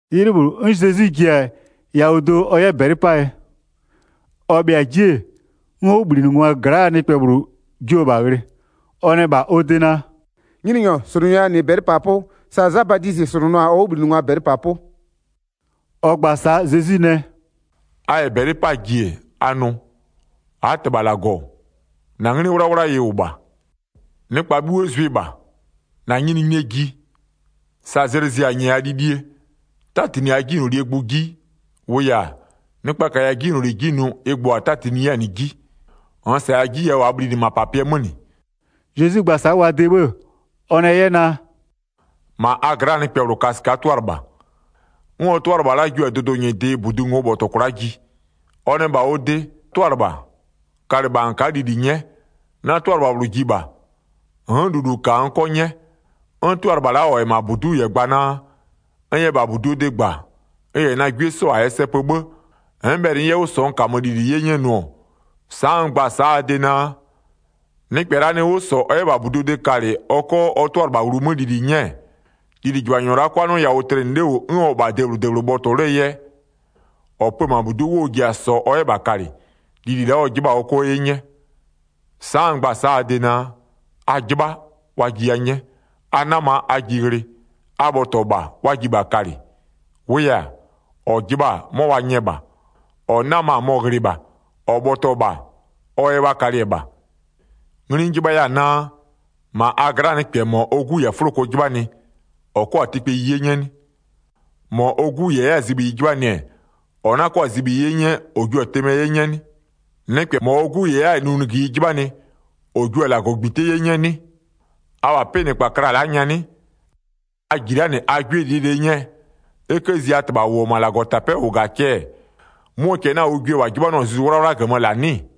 'Ylɩ -bhlʋ, 'n Zezwi ji-a yawʋ do ɔ 'yɛ -bɛlɩ 'paa yɛ. Ɔ bhɩa-a 'ji-e, 'n ɔ 'wʋbhlinɩngwaa gla'aa nɩkpɛ -bhlʋ jio-o -bha ghlɩ, ɔ nɛ -bha ɔ de naa: “Nyininyɔ, -slʋnʋya -nɩ -bɛlɩpapʋ, sa Za Badizɩ -slʋnʋ-a ɔ 'wʋbhlinɩngwa -bɛlɩpapʋ.” Ɔ gba-a sa'a Zezwi nɛ: “A -yɛ -bɛlɩ 'paa ji-e, a nʋ: -Aa -Tɩbha -Lagɔ, -na 'nglɩ 'wlawla ɩ -wʋ -bha, nɩkpa 'bhuo zʋɩ -bha. -Na nyininyinie ji. Sa zlɩ zɩ-a -nyɛya lilie. 'Tatinɩ -aa 'jinylolie gbʋ 'ji, -wʋʋ yɛ-a, nɩkpa -kaya 'jinyloli 'ji nʋ ɩ gbʋ -a 'tatinɩ 'yɛ-a -nɩ 'ji. -Nn -saya 'ji yawʋ -aa bhlinɩ -mapapɩɛ 'mö -nɩ.” Zezwi gba-a sa'a wa de 'bhë, ɔ nɛ 'yɛ naa: “-Ma a gla'aa nɩkpɛ -bhlʋ ka -sɩka'a 'tʋalɩbha, 'n ɔ 'tʋalɩbha la'a jio-a dʋdʋ -nyɩdɩ -budu ngo'o bhɔtɔ kwla'a ji, ɔ nɛ -bha ɔ de: 'Tʋalɩbha, kalɩ -bha -n ka'a lili 'nyɛ, na 'tʋalɩbha -bhlʋ ji -bha, n'n lulu -ka n 'kɔ 'nyɛ. 'N 'tʋalɩbha la'a -ɔ -wʋ-ɔ -ma -budu'u -yɛ gba naa: N yɛ -bha -buduo de gba, n -yɛ na 'gwie 'sɔ -a yɛ sɛ pö 'bhë, n'n bhɛlɩ n 'yɛ 'wʋ -sɔ n -kamö lili 'ye 'nyɛ nʋ-ɔ, sa'a n gba-a sa'a a de naa, nɩkpɛ la'a nɩ 'wʋ -sɔ ɔ 'yɛ -bha -buduo de kalɩ ɔ 'kɔ ɔ 'tʋalɩbha wlumö lili 'nyɛ-ɛ, lilijɩbhanyɔ la'a 'kwa 'nɩɔ yawʋ tlɩnɩ 'le -wʋ 'n ɔ -wʋ-ɔ -bha debhlʋ -debhlʋ bhɔtɔ 'lee yɛ, -ɔ pö-ö -ma -budu'u, 'wʋ ɔ ji-a -sɔɔ ɔ 'yɛ -bha kalɩ, lili la'a ɔ 'jɩbha-a ɔ 'kɔ 'ye 'nyɛ. Sa'a n gba-a sa'a a de naa: A 'jɩbha, wa jiya 'nyɛ. A 'nama, a ji ghlɩ. A bhɔtɔ -bha, wa ji -bha kalɩ. 10-Wʋʋ yɛ-a, -ɔ jɩbha-a 'mɔ wa nyɛ -bha, -ɔ 'nama-a mɔ-ɔ ghlɩ -bha -ɔ bhɔtɔ-ɔ -bha, ɔ yɛ wa kalɩ-ɛ -bha. Ngli n jɩbhaya-a naa: -Ma a gla'aa nɩkpɛ -mɔ ɔ 'gu -yɛ-a 'fʋloko 'jɩbhanɩ, -ɔ 'kɔ-a tɩkpeyi 'ye 'nyɛ 'nɩ? -Mɔ ɔ 'gu -yɛ 'yɛ-a zibhiyi 'jɩbhanɩ-ɛ, ɔ 'na kɔ-a zibhiyi 'ye 'nyɛ ɔ 'kɔ-a tɩmɛ 'ye 'nyɛ 'nɩ? Nɩkpɛ -mɔ ɔ 'gu ji 'yɛ-a nunugïyi 'jɩbhanɩ -ɔ jio-a -lagɔgbite 'ye 'nyɛɛ 'nɩ? Abha 'pɩnɩkpa kla la'a nyanɩ, a -ji la'a -nɩ a 'gwie -lie -lie 'nyɛɛ, e 'kë zi a -Tɩbha -ʋ -wʋ-ɔ -ma -Lagɔtapɛ'ɛ -ʋ -ga-a cɛ-ɛ 'mʋɔ cɛ 'na-a ʋ gwie -wa 'jɩbhanʋ-a Zuzu 'Wlawla -gömö -laa 'nɩ-ɩ?”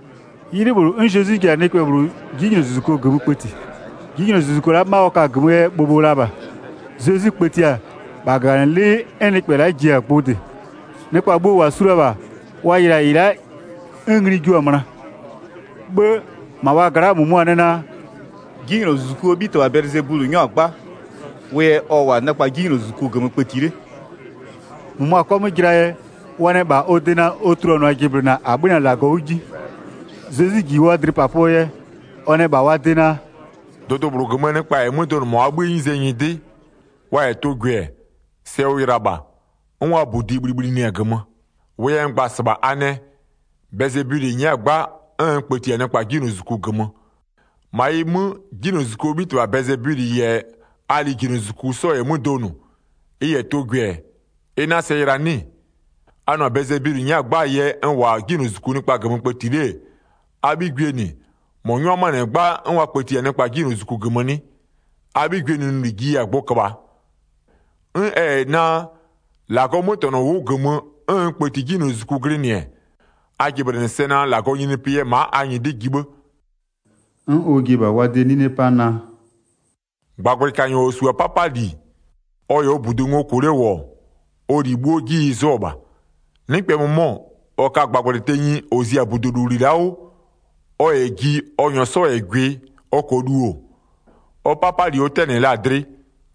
'Ylɩ -bhlʋ, 'n Zezwi ji-a nɩkpɛ -bhlʋ 'jinylozuzuko -gömö kpëti. 'Jinylozuzuko la'a 'ma ɔ ka-a -gömöö yɛ bhobho la -bha. Zezwi kpëtia-a, -bha -gaganɩlɩ'ɩ 'n nɩkpɛ la'a ji-a gbʋ -dɩ. Nɩkpa bhuo -wa su la-a -bha, wa yɩlɩ-a -ɩ la'a 'n ngli jua-a möna. 'Bhë -ma wa gla'aa -mʋmʋa nɛ naa: “'Jinylozuzukuo 'bhitɩbha Bɛlɩzebulɩ 'nyɔ-a 'gba, wʋ yɛ ɔ -wʋ-a nɩkpa 'jinylozuzuku -gömö kpëti 'le.” 16-Mʋmʋa 'kɔ 'mö jɩlaa yɛ, wa nɛ -bha ɔ de naa ɔ tuluanʋa jɩblɩna -a 'bhönɩ-a -Lagɔ 'wʋ 'ji. Zezwi -ji wa dlɩpapʋɔ yɛ, ɔ nɛ -bha wa de naa: “Dʋdʋ -bhlʋ -gömöö nɩkpa -yɛ 'mö donʋ -ma wa 'bhïë 'nyize nyɩdɩ, wa -yɛ tʋ gwɩ-ɛ, sɛ ʋ yɩla -bha, 'n wa -budi bhlibhlinɩ-a -gömö. 18-Wʋʋ yɛ n gba-a -sɩbha, a nɛ: Bɛlɩzebulɩ nyɛ'ɛ-a 'gba 'n n kpëti-a nɩkpa 'jinylozuzuku -gömö, -ma ɩ 'mö, 'jinylozuzukuo 'bhitɩbha Bɛlɩzebulɩ -yɛ a lijinylozuzuku 'sɔ -yɛ 'mö donʋ, ɩ -yɛ tʋ gwɩ-ɛ, ɩ 'na sɛ yɩla 'nɩ-ɩ? A nʋ-ɔ naa Bɛlɩzebulɩ nyɛ'ɛ-a 'gbaa yɛ n -wʋ-a 'jinylozuzuku nɩkpa -gömö kpëti 'le-e, a 'bhigwiee -nɩ, -mɔ 'nyʋa 'mö-a -nɩ 'gba 'n wa kpëti-a nɩkpa 'jinylozuzuku -gömö 'nɩ? A 'bhigwiee nʋnʋli mɩ-ɩ jiya-a gbʋ köbhaa. 'N ɛ -yɛ naa, -Lagɔɔ 'mötɛnɔ wʋ'ʋ -gömö 'n n kpëti 'jinylozuzuku glɩnɩ-ɛ, a jɩblɩnɩ sɛ naa, -Lagɔɔ nyininyinipɩ yɛ ma'a a nyɩdɩ ji 'bhë.” 'N ɔ ji-e -bha wa de 'nine 'pa naa: “-Gbagblɩkanyɔ -ɔ -su-a 'papali, ɔ -yɛ ɔ -budu ngo -kʋ 'le -wʋ-ɔ, ɔ -li 'bhuo 'ji ɩ 'zʋɔ -bha. Nɩkpɛ -mʋmɔ, -ɔ ka-a -gbagblɩ tenyi -ɔ zi-a -budulowli la'a 'wʋ, ɔ -yɛ ji ɔ -nyɔɔ 'sɔ -yɛ gwɩ ɔ -kɔɔ lu-o, ɔ 'papali ɔ 'tɛnɩ la-a dlɩ,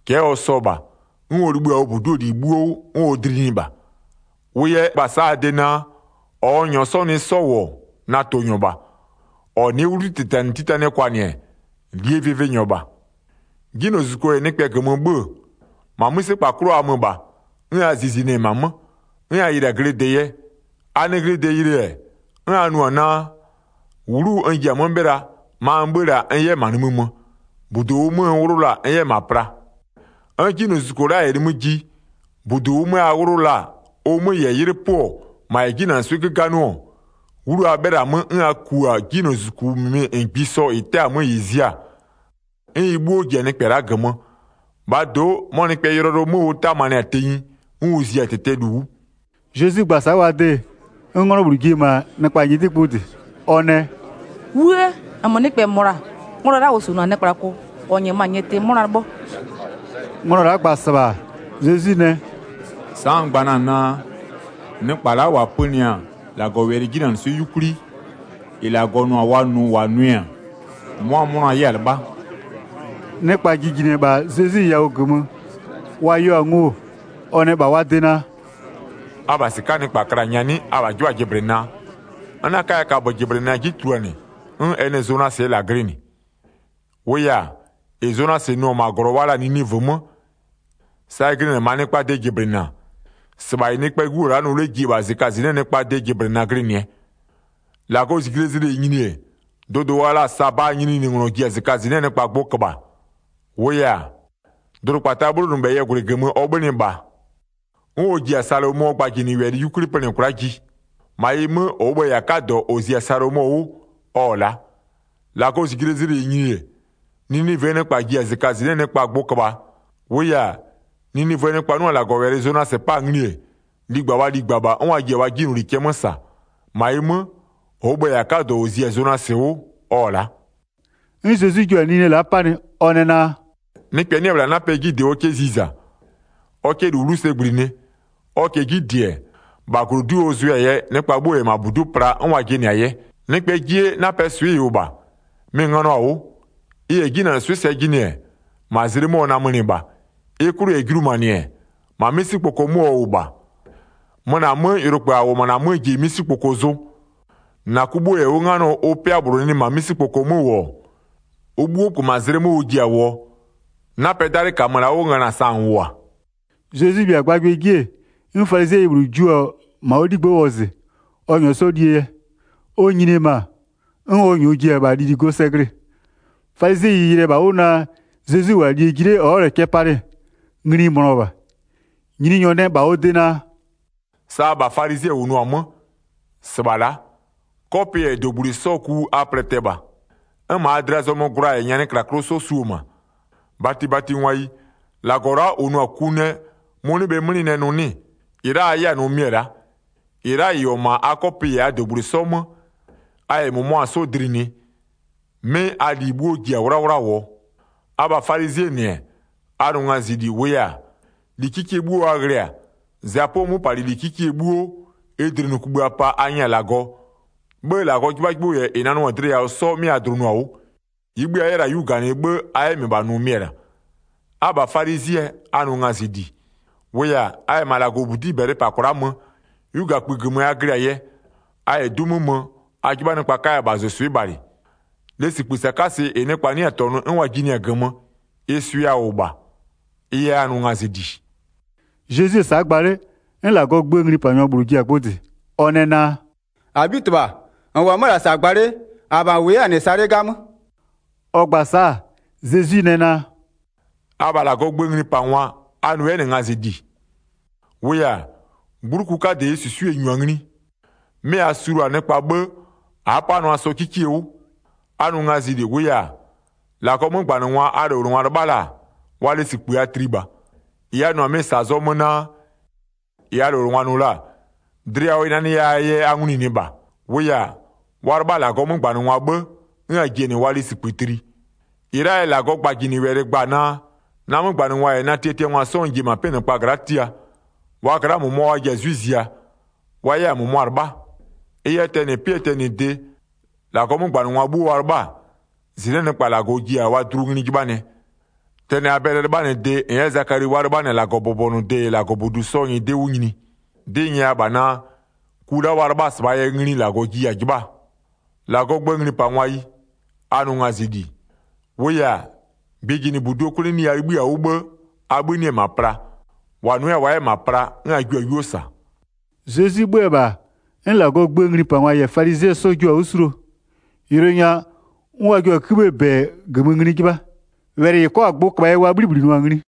cɛ'ɛ ɔ sɔ -bha, 'n ɔ libhï-a ɔ -budu'uo -li 'bhuo 'wʋ 'n ɔ dlinɩɩ -bha. Wʋ yɛ n gba-a sa'a a de naa: -Ɔ n -nyɔɔ nɩ 'sɔ -wʋ-ɔ, na tʋnyɔ -bha. -Ɔ nɩ'ɩ 'wlutitanɩtitanɩɛ kwanɩ-ɛ, -lie vɩvɩnyɔ -bha. 'Jinylozuzuko -yɛ nɩkpɛ -gömö 'bhö-ö, -ma 'mïsekpa 'klʋ a mö -bha, 'n a zizinɩ-ɛ -ma 'mö, 'n a yɩlɩ-a glɩde yɛ. A nɩ glɩde ghlɩ-ɛ, 'n a nʋ-ɔ naa: 'Wlu n ji-a 'mö 'bhɩla, ma n 'bhö-ö la-a n 'yɛ -ma nimï mö, -budu -ʋʋ 'mö n 'wlʋ la-a n 'yɛ -ma pla. 'N 'jinylozuzuko la'a -yɛ nimï ji, -budu -ʋʋ 'mö a 'wlʋ la-a ʋ 'mö -yɛ 'ylɩpöɔ -ma -yɛ 'jinanɩswɩ'ɩ 'göganɩɔ-ɔ, 'wlu a 'bhɩla-a 'mö, 'n a ku-a 'jinylozuzuku -mɩmɩ -ngbisɔ -ɩ 'tɛ-a 'mö -ɩ zia-a, 'n ɩ 'bhuo ji-a nɩkpɛ la'a -gömö. -Bhaa do'o, 'mɔ nɩkpɛɛ yʋlɔyʋlʋ 'mö ʋ 'tamanɩ-a tenyi 'n ʋ zi-a -tɩtɛɛ -lu 'wʋ.” Zezwi gba-a sa'a wa de, 'n 'nglɔ -bhlʋ ji-e -ma nɩkpa -nyɩdɩ gbʋ -dɩ, ɔ nɛ: “'Wuë! -Nmö nɩkpɛ -mɔ -la, nglɔ la'a -ɔ -suo -na nɩkplako, -ɔ -nyɛmö-a nyɩtɩ 'mʋna 'lɩbhɔ.” Nglɔ la'a gba-a -sɩbha, Zezwi nɛ: “Sa'a n gba na-a naa: Nɩkpa la'a -wa pönɩ-a -Lagɔwɛlɩ 'jinanɩswɩ'ɩ 'yukwli, -ɩ -Lagɔ nʋ-a wa nʋ -wa nʋɩ-a mʋa 'mʋna 'yɛ-a 'lɩbha.” Nɩkpa jijinɩ-ɛ -bha Zezwi yawʋ -gömö wa yeo-a ngo, ɔ nɛ -bha wa de naa: “Abha -sɩka'aa nɩkpa kla-a nyanɩ, abha 'jɩbha-a jɩblɩnaa? N 'na 'kaya kaböjɩblɩna 'ji tuluanɩ 'n ɛ nɩ Zonasɩɛ -la glɩnɩ. 30-Wʋʋ yɛ-a, -ɩ Zonasɩ nʋ-ɔ -ma -glɔ wa la-a Ninivöö 'mö, sa ɩ glɩnɩ-ɛ -maa nɩkpaa de jɩblɩna-a, -sɩbha -ɩ Nɩkpɛɛ 'Gu -wʋ-ɔ la'a nʋ 'le ji-e -bha -zɩkazɩnɩ'ɩɛ nɩkpaa de jɩblɩna glɩnɩɛ. 31-Lagɔɔ -zijlee zlɩ -yɛ nyini-e, dʋdʋ wa la-a Sabaa nyininyininglɔ ji-a -zɩkazɩnɩ'ɩɛ nɩkpa gbʋ köbhaa. -Wʋʋ yɛ-a, dʋdʋkpataa 'bhlonʋbhɛyɩɛ -gwlɩ -gömö ɔ 'bhönɩ -bha 'n ɔ ji-a Salomɔɔ gbajinɩwɛlɩ 'yukwli -pönɩ kwla'a ji. -Ma ɩ 'mö, -ɔɔ bhë-ë -yɛ-a 'kadɔ -ɔ zi-a Salomɔ 'wʋ, ɔ-ɔ la'a. 32-Lagɔɔ -zijlee zlɩ -yɛ nyini-e, Ninivöö nɩkpa ji-a -zɩkazɩnɩ'ɩɛ nɩkpa gbʋ köbhaa. -Wʋʋ yɛ-a, Ninivöö nɩkpa 'nʋ-a -Lagɔwɛlɩ Zonasɩ 'pa-a ngli-e, ligba wa ligba -bha 'n wa ji-a wa 'jinyloli cɛ 'mö -sa. -Ma ɩ 'mö, -ɔɔ bhë-ë -yɛ-a 'kadɔ -ɔ zi-a Zonasɩ 'wʋ ɔ-ɔ la'a.” 'N Zezwi jua-a nine la'a 'panɩ. Ɔ nɛ naa: “Nɩkpɛ 'nɩ-ɛ -bhla 'napɛ 'ji -dɩ ɔ 'kɛ ziza, ɔ 'kɛ -lu 'wlu sɛ -gblinɩ. Ɔ -kɛɛ 'ji -dɩ-ɛ, -bha -glodu'u ɔ zʋɩɛ-a yɛ, nɩkpa 'bhuo -yɛ -ma -budu'u pla 'n wa jɩnɩ-a yɛ. Nɩkpɛɛ 'jie, 'napɛɛ swɩ'ɩ ɩ -wʋ -bha. Mɩ-ɩ ngönɔ-a 'wʋ. Ɩ -yɛ 'jinanɩswɩ'ɩ sɛ jɩnɩ, -ma zlɩ 'mö ɔ namönɩ -bha. Ɩ 'klʋ -yɛ julumanɩ-ɛ, -ma 'misikpoko 'mö ɔ -wʋ -bha. Möna 'mö, yʋlokpë -a -wʋ-ɔ -ma -na 'mö ji-e 'misikpoko zʋ. 36-Na ku 'bhuo -yɛ 'wʋ 'nganɔ ʋ 'pɩa -bhlʋ nɩ -ma 'misikpoko 'mö -wʋ-ɔ, ʋ 'bhuo -kpö -ma zlɩ 'mö ʋ ji-a -wʋɔ, 'napɛɛ 'dalɩ -kamö la'a 'wʋ ngöna sa -n -wʋ-a.” Zezwi 'bhɩa-a gbagbɩɛ 'ji, 'n falizɩɛyi -bhlʋ jio-o -ma ɔ 'ligbë'ë wɔzɩ, ɔ -nyɔɔ 'sɔ 'yɛ lie yɛ. Ɔ nyini-e -ma, 'n ɔ ji-e -bha lili go sɛ glɩ-ɩ. Falizɩɛyi yɩlɩ-ɛ -bha 'wʋ naa Zezwi -wʋ-a lie ji 'le ɔ'ɔ-ɔ cɛ palɩ-ɛ, ngli ɩ mönɔ -bha. Nyininyɔ nɛ -bha ɔ de naa: “Sa abha falizɩɛ -wʋnʋ-a 'mö, -sɩbha la'a: 'kɔpɩ -yɛ -dogblui 'sɔɔ ku a plɛtɛ -bha, 'n -ma a dlɩa zɔmö gwla -yɛ nyanɩklaklʋ 'sɔ su-o -ma. 40-Batibatingwayi, -Lagɔ la'a -ʋ nʋ-a ku nɛ mʋ-ʋ 'nɩ-ɛ 'mlɩ nɛ nʋ 'nɩ-ɩ? 41-Ɩ a 'yɛ-a nʋ mɩ-ɛ la'a, -ɩ la'a -ɩ -wʋ-ɔ -ma a 'kɔpɩ -yɛ a -dogblui 'sɔ 'mö, a -yɛ -mʋmʋa 'sɔ dlinɩɩ, 'mɩ a -li 'bhuo ji-a 'wlawla -wʋɔ. Abha falizɩɛ -nɩ-ɛ, a nʋ ngazɩli, -wʋʋ yɛ-a, -li 'kikie 'bhuo a ghlɩ-a, zapʋɔ 'möpalɩli 'kikie 'bhuo, ɩ -dlinɩkugbïa pa a nyɛ-a -Lagɔ, 'bhë -Lagɔɔ 'jɩbhajɩbhʋ -yɛ -ɩ nanʋ-a dlɩ yawʋ 'sɔ 'mɩ a dlʋnʋ-a 'wʋ. -Ɩɩ 'bhï a 'yɛ la-a 'yu -ganɩ 'bhë, a 'yɛ -mɩbha nʋ mɩ-ɛ -la. Abha falizɩɛ, a nʋ ngazɩli. -Wʋʋ yɛ-a, a -yɛ -ma -Lagɔbudi'i -bɛlɩ -pa kwla'a mö, 'yugakpï -gömö a glɩ-a yɛ, a -yɛ 'du 'mö mö, a 'jɩbha nɩkpa 'kaya -bhazʋswɩ'ɩ bhalɩ. Lesikpï -sakasɩ -ɩ nɩkpa 'nɩ-a -tɔnʋ 'n wa jinɩɩ-a -gömö, ɩ swɩ'ɩ a -wʋ -bha, ɩ yɛ a nʋ ngazɩli.” Zezwi-e sa'a gba 'le, 'n -Lagɔɔ gböö nglipanyɔ -bhlʋ ji-a gbʋ -dɩ, ɔ nɛ naa: “-Abhitɩbha, -n -wʋ-ɔ 'mö-ö -la -sa gba 'le, -abha -n -wʋ 'yɛ-a -nɩ sa 'le 'gamö.” Ɔ gba-a sa'a, Zezwi nɛ naa: “Abha -Lagɔɔ gböö nglipangwa, a nʋ 'yɛ -nɩ ngazɩli. -Wʋʋ yɛ-a, 'gbluku 'kadɩ -ɩɩ -susue-e -nyu-a ngli, 'mɩ a sulua-a nɩkpa 'bhë, a'a 'panʋa 'sɔ 'kikie 'wʋ. A nʋ ngazɩli, -wʋʋ yɛ-a, -Lagɔɔ 'mögbanɩngwa a -lowlengwa 'lɩbha la-a, wa lesikpï a tli -bha. 48-Ɩ a nʋ-ɔ -la, -ɩ zɔmö-a naa: -Ɩ a -lowlengwa nʋ la-a, dlɩ yawʋ ɩ nanɩya-aa yɛ a nglunʋɩ -bha. -Wʋʋ yɛ-a, wa 'lɩbha-a -Lagɔɔ 'mögbanɩngwa 'bhë, 'n a ji-a -nɩ wa lesikpï tli. 49-Ɩ la'aa yɛ, -Lagɔɔ gbajinɩwɛlɩ gba-a naa: Na 'mögbanɩngwa -yɛ na tiatiangwa 'sɔ n ji-e -ma 'pɩnɩkpa gla'a tia. Wa gla'aa -mʋmʋa wa ji-a 'zwɩ ziaa, wa 'yɛ-a -mʋmʋa 'lɩbha. Ɩ yɛ, tɛnɩ 'pɩɛ tɛnɩde, -Lagɔɔ 'mögbanɩngwa 'bhuo wa 'lɩbha-a, -zɩnɩ'ɩɛ nɩkpa -Lagɔ ji-a wa dlu ngli 'jɩbhanɩɛ. Tɛnɩ Abɛlɩɛ 'lɩbhanɩde -n 'yɛ Zakali wa 'lɩbhanɩ-a -Lagɔbʋbɔnʋde -yɛ -Lagɔbudu 'sɔɔ nyɩdɩ 'wʋ nyini. 'Dɩ n nyɛya -bha naa, ku la'a wa 'lɩbha-a -sɩbhaa yɛ ngli -Lagɔ jua-a 'jɩbhaa. 52-Lagɔɔ gböö nglipangwayi, a nʋ ngazɩli. -Wʋʋ yɛ-a, gbɩjinɩbuduo 'kwleneyi a 'libhï-a 'wʋ 'bhë, abhï 'nɩ-ɛ -ma pla. -Wa nʋ 'yɛ-a wa 'yɛ -ma pla, 'n a jua-a 'yuo -sa.” Zezwi 'bhö-ö -bha, 'n -Lagɔɔ gböö nglipangwa -yɛ falizɩɛ 'sɔ jio-a 'wʋ 'suluo, yʋlʋ nya 'n wa jio-a 'kïbhïë -bɛ -gömö ngli 'jɩbha. Wɛlɩ -ɩ 'kɔ-a gbʋ köbhaa yɛ wa 'bhlibhlinɩɔ-a ngli.